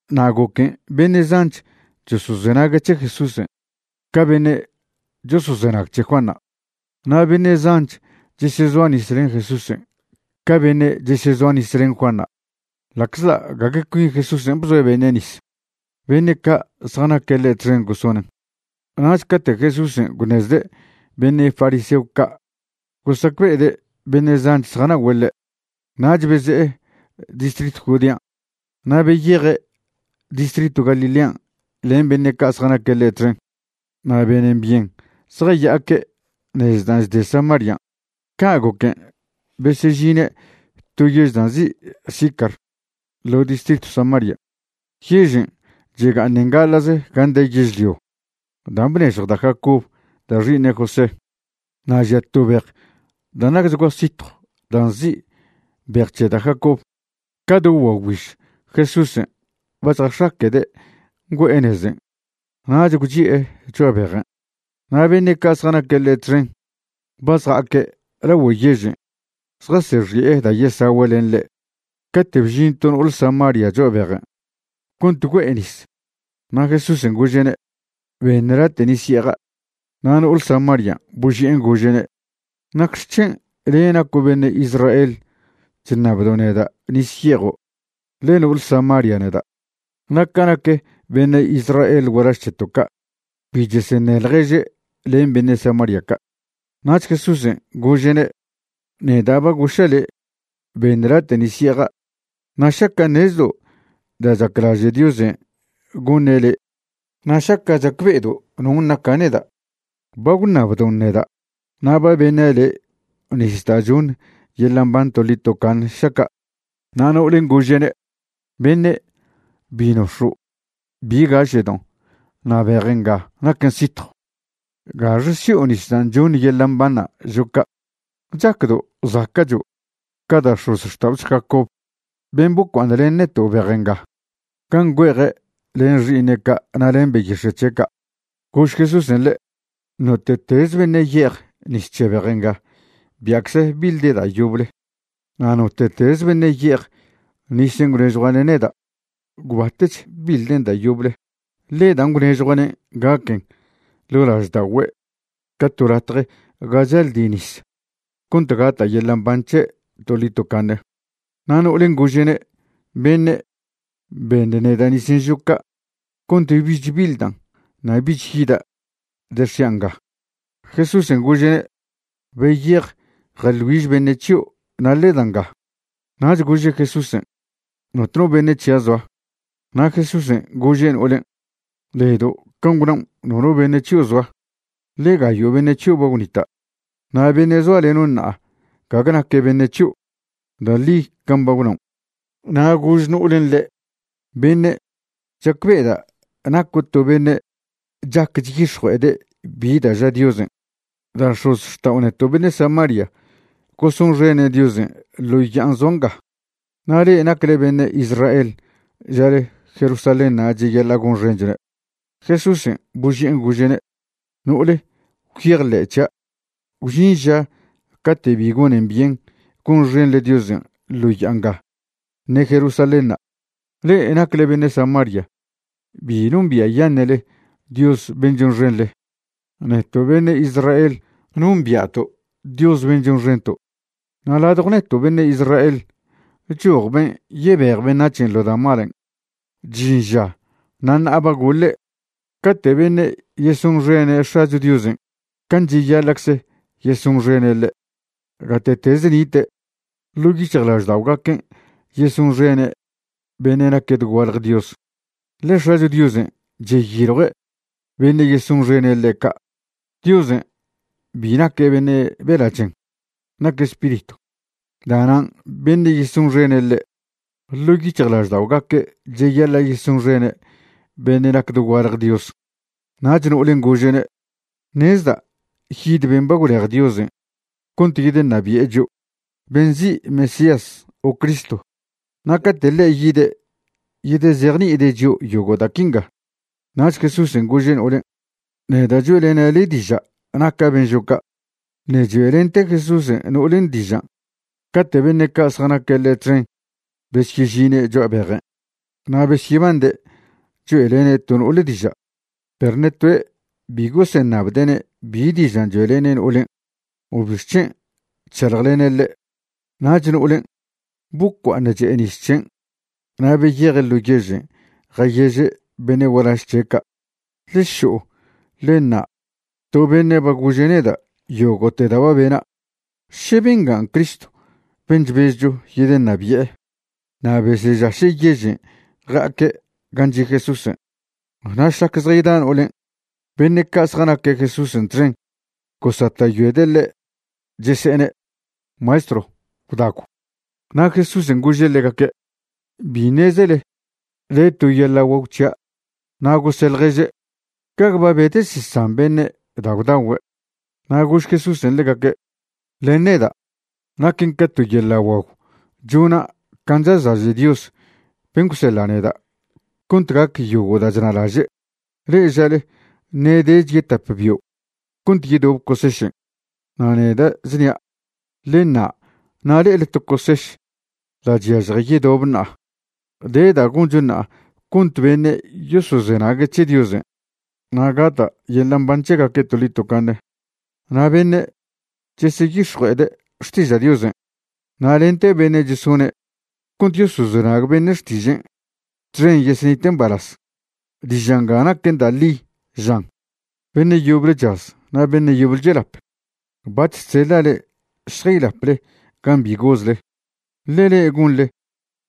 Na' goquen' beṉe' zanch chosozenague' c̱he Jesúsen' ca beṉe' chosozenag c̱he Juanṉa', na' beṉe' zanch chesezoa nis len Jesúsen' ca beṉe' chesezoa nis len Juanṉa', ḻa'czḻa' gague cuin Jesúsen' bzoe' beṉe' nis, beṉe' ca' zjanaque' ḻe' txen gosonen'. Nach cate' Jesúsen' gwṉezde' beṉe' fariseo ca' gosacbe'ede' beṉe' zanch zjana'ogüe' ḻe', nach beze'e distritw Judean' na' beyeje' distritw Galilean' len beṉe' ca' zjanaque' ḻe' txen. Na' benen byen zjaya'aque' nez da' chde Samarian'. Ca' goquen' besežine' to yež da' nzi' Sicar ḻo distritw Samarian'. Yežen' chega'aṉen gaḻa'ze gan' de yežlio dan' bnežjw da' Jacob da' xi'iṉe' José. Na' žia to bej da' nacchgua sitjw da' nzi' Bej c̱he da' Jacob. Ca do guagwbiž Jesúsen' ba chjax̱aquede' ngüe'e nezen' nach gwchi'e cho'a bejen'. Na' beṉe' ca' zjanaque' ḻe' txen ba zja'aque' lagüe yežen' zjasexi'e da' yesagüe' len ḻe', cate' bžin to no'ole Samaria cho'a bejen' cont güe'e nis. Na' Jesúsen' gože'ne': ―Beṉ late' nis ye'eja'. Na' no'ole Samarian' boži'en gože'ne': ―¿Nacxec̱hen' le' naco' beṉe' Israel chṉabdo' neda' nis ye'ejo'? ḻe no'ole Samaria neda'. (Na' ca nac beṉe' Israel gualaž c̱heto' ca', bi cheseṉe ḻježe' len beṉe' Samaria ca'.) Nach Jesúsen' gože'ne': ―Neda' ba goša' le': “Beṉ late' nis ye'eja'”, na' šaca' ṉezdo' da' chaclaže' Diosen' goṉe' le' na' šaca' chacbe'edo' non' naca' neda', ba gwṉabdon' neda' na' ba beṉa' le' nis da' choṉ yeḻa' mban toḻi tocaṉe šaca'. Na' no'olen' gože'ne': ―Beṉe', bi nox̱o' bi gaše'don' na' bej nga naquen sitjw. ¿Gaxe si'o nis da' choṉ yeḻa' mbanṉa' žo' ca'? ¿Chacdo' zaca'cho' ca da' x̱ozxta'ocho Jacob ben' bocua'aṉ len neto' bej nga gan' güe'eje' len xi'iṉe' ca' na' len beyix̱e' c̱he' ca'? Gož Jesúsen' ḻe': ―Note'tez beṉe' ye'ej nis c̱he bej nga bia'cze biḻde' da' yoble. Na' note'tez beṉe' ye'ej nisen' gwnežjua'ne' neda', gwbatech biḻden' da' yoble, ḻe dan' gwnežjua'nen' gaquen ḻo' lažda'ogüe' ca to latje ga chaldi nis cont gata' yeḻa' mban c̱he' toḻi tocaṉe. Na' no'olen' gože'ne': ―Beṉe', beṉ neda' nisen' žo' ca' cont bich biḻdan' na' bich yida' dex̱ian' nga. Jesúsen' gože'ne': ―Beyej jeḻ güiž beṉe' c̱hio' na' ḻe da nga. Nach gože' Jesúsen': ―Notno beṉe' c̱hia' zoa. Na' Jesúsen' gože' no'olen': ―Ledo' can' gwnaon' nono beṉe' c̱hio' zoa, ḻe gayo' beṉe' c̱hio' ba gwnita' na' beṉe' zoaleno' ṉa'a gague naque' beṉe' c̱hio'. Da' ḻi can' ba gwnaon'. Na' gož no'olen' ḻe': ―Beṉe', chacbe'eda' naco' to beṉe' chac chyix̱jue'ede' bi da' ža Diosen'. Da' x̱ozxta'o neto' beṉe' Samaria gosonxene' Diosen' ḻo ya'an zoa nga, na' le'e nacle beṉe' Israel žale Jerusalénṉa' cheyaḻa' gonxenchone'. Jesúsen' boži'en gože'ne': ―No'ole, gwyejḻe' c̱hia', gwžin ža cate' bi gonen byen gonxenḻe Diosen' ḻo ya'a nga ṉe Jerusalénṉa'. Le'e nacle beṉe' Samaria bi nombia'yaṉe'le Dios ben' chonxenḻe. Neto' beṉe' Israel nombia'to' Dios ben' chonxento', na' ladjo' neto' beṉe' Israel choj ben' yebej beṉac̱hen' ḻo da' malen'. Chžin ža na' ṉa'a ba goḻe', cate' beṉe' yesonxene' X̱acho Diosen' can' cheyaḻa'cze yesonxene' ḻe', gate'tez nite', ḻo' yic̱hjlažda'ogaquen' yesonxene' beṉe' naque' dogualje Dios, ḻe X̱acho Diosen' cheyiljue' beṉe' yesonxene' ḻe' ca'. Diosen' bi naque' beṉe' bela' chen, naque' spiritw. Da'nan' beṉe' yesonxen ḻe', ḻo' yic̱hjlažda'ogaque' cheyaḻa' yesonxene' beṉe' nac dogualje Dios. Nach no'olen' gože'ne': ―Ṉezda' yid ben' ba gwlej Diosen' cont yedeṉabi'e chio', ben' nzi' Mesías o Cristo, na' cate' ḻe' yide' yedezejni'ide' chio' yogo' da' quinga. Nach Jesúsen' gože' no'olen': ―Neda' choe'lena' le' diža' naca' ben' žo' ca'. Ṉe' choe'lente Jesúsen' no'olen' dižan' cate' beṉe' ca' zjanaque' ḻe' txen besyežine' cho'a bejen'. Na' besyebande' choe'lene' to no'ole diža', perw ṉe toe' bi goseṉabde'ne' bi dižan' choe'lene' no'olen' o bixc̱hen' chšaḻjlene' ḻe'. Nach no'olen' bocua'aṉ che'e nis c̱hen' na' beyeje' ḻo yežen' jayeže' beṉe' gualaž c̱he' ca': ―Ḻe šo'o ḻe ṉa' to beṉe' ba gože' neda' yogo'te da' ba bena'. ¿Še bengan' Cristo ben' chbezcho yedeṉabi'e? Na' besežaše' yežen' ja'aque' gan' chi' Jesúsen'. Na' šlac zjayda no'olen', beṉe' ca' zjanaque' Jesúsen' txen gosata'yoede' ḻe', chese'ene': ―Maestrw, gwdagw. Na' Jesúsen' gože' ḻegaque': ―Bi ṉezele de to yeḻa' guagw c̱hia'. Na' gose' ḻježe': ―¿Gague ba bedesesan beṉe' da' gwdagüe'? Na' gož Jesúsen' ḻegaque': ―Len neda' naquen ca to yeḻa' guagw chona' can' chazlaže' Dios ben' gwseḻa' neda' cont gac yogo' da' chnalaže'. Le'e žale: “Ṉe' dech yetap bio' cont yedobe cosešen'.” Na' neda' chnia', ḻe ṉa' na' le'ele to coseš da' chyažje yedob ṉa'a. De da' goncho ṉa'a cont beṉe' yosozenague' c̱he Diosen' na' gata' yeḻa' mban c̱hegaque' toḻi tocaṉe. Na' beṉe' cheseyix̱jue'ede' xtiža' Diosen' na' lente beṉe' chesone' cont yosozenag beṉe' xtižen' txen yesenite' mbalaz. Diža' nga naquen da' ḻi, žan: “Beṉe' yoble chaz na' beṉe' yoble chelap.” Bac̱h chseḻa' le'e šjaylaple gan' bi gozle, ḻe le'e gonḻe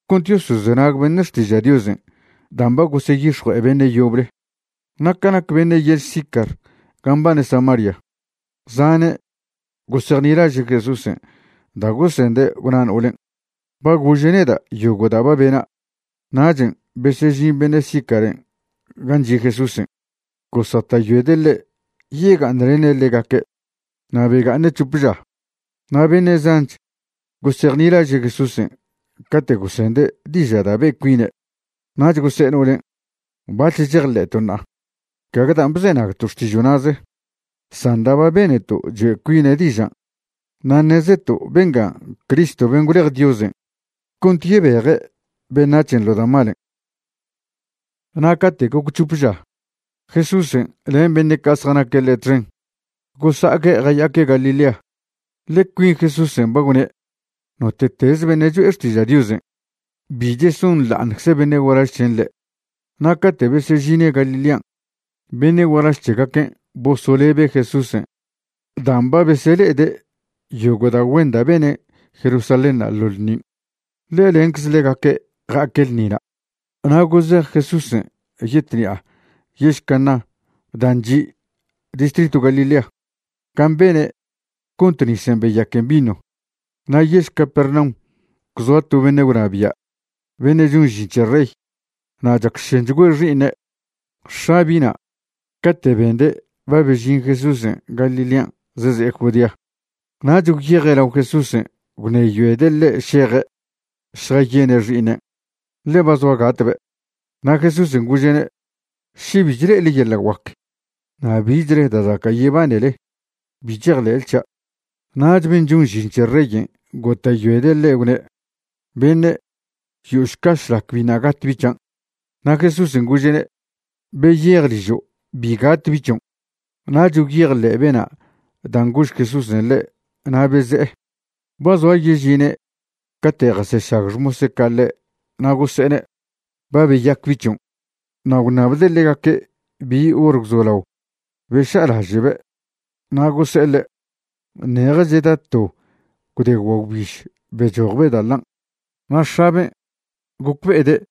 cont yosozenag beṉe' xtiža' Diosen' dan' ba goseyix̱jue'e beṉe' yoble. Na' ca nac beṉe' yež Sicar ga mbane Samaria, zane' gosejnilaže' Jesúsen' da' gosende' gwna no'olen': “Ba gože' neda' yogo' da' ba bena'.” Nachen' besežin beṉe' Sicaren' gan' chi' Jesúsen' gosata'yoede' ḻe' yega'aṉlene' ḻegaque', na' bega'aṉe' c̱hope ža. Na' beṉe' zanch gosejnilaže' Jesúsen' cate' gosende' diža' da' be' cuine'. Nach gose'e no'olen': ―Bac̱h chejḻe'to' ṉa'a, gague dan' bzenagto' xtižo' na'ze, san da' ba beneto' choe' cuine' dižan', na' ṉezeto' bengan' Cristo ben' gwlej Diosen' cont yebeje' beṉac̱hen' ḻo da' malen'. Na' cate' goc c̱hop ža, Jesúsen' len beṉe' ca' zjanaque' ḻe' txen gosa'aque' jaya'aque' Galilea. Ḻe cuin Jesúsen' ba gwne' note'teze beṉe' cho'e xtiža' Diosen', bi chesonḻa'aṉcze beṉe' gualaž c̱hen' ḻe'. Na' cate' besežine' Galilean' beṉe' gualaž c̱hegaquen' bosolebe' Jesúsen' dan' ba besele'ede' yogo' da' güen da' bene' Jerusalénṉa' ḻo ḻṉin', ḻe lencze ḻegaque' ja'aque' ḻṉina'. Na' gozej Jesúsen' yetṉi'a yež Caná dan' chi' distritw Galilea gan' bene' cont nisen' beyaquen vino. Na' yež Capernaum gwzoa to beṉe' gwnabia' beṉe' chon žin c̱he rey, na' chacšenchgüe xi'iṉe'. X̱a bi'na' cate' bende' ba bežin Jesúsen' Galilean' zeze'e Judean', nach gwyeje' lao Jesúsen' gwṉeyoede' ḻe' šeje' šjayene' xi'iṉen', ḻe ba zoa gatbe'. Na' Jesúsen' gože'ne': ―Še bi chle'ele yeḻa' guac na' bichle da' zaca' yebanele, bi chejḻe'le c̱hia'. Nach ben' chon žin c̱he reyen' gota'yoede' ḻe' gwne': ―Beṉe', yo'ošca šlac biṉa' gat bi' c̱hian'. Na' Jesúsen' gože'ne': ―Beyej ližo', bi gat bi' c̱hion'. Nach gwyejḻe' bena' dan' gož Jesúsen' ḻe' na' beze'e. Ba zoa yežine' cate' jasešag xmose' ca' ḻe' na' gose'ene': ―Ba beyac bi' c̱hion'. Na' gwṉabde' ḻegaque' bi hor gwzolao beša'alaže'be', na' gose'e ḻe': ―Ṉeje cheda to gwde guagwbiž bechojbe' da' ḻan'. Na' x̱aben' gocbe'ede'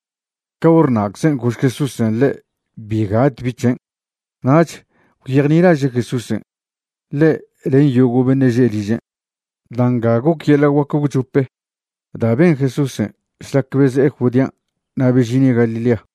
ca hor na'czen' gož Jesúsen' ḻe' bi gat bi' c̱hen'. Nach gwyejnilaže' Jesúsen', ḻe' len yogo' beṉe' že' ližen'. Da' nga goc yeḻa' guac gwchop da' ben Jesúsen' šlac beze'e Judean' na' bežine' Galilea.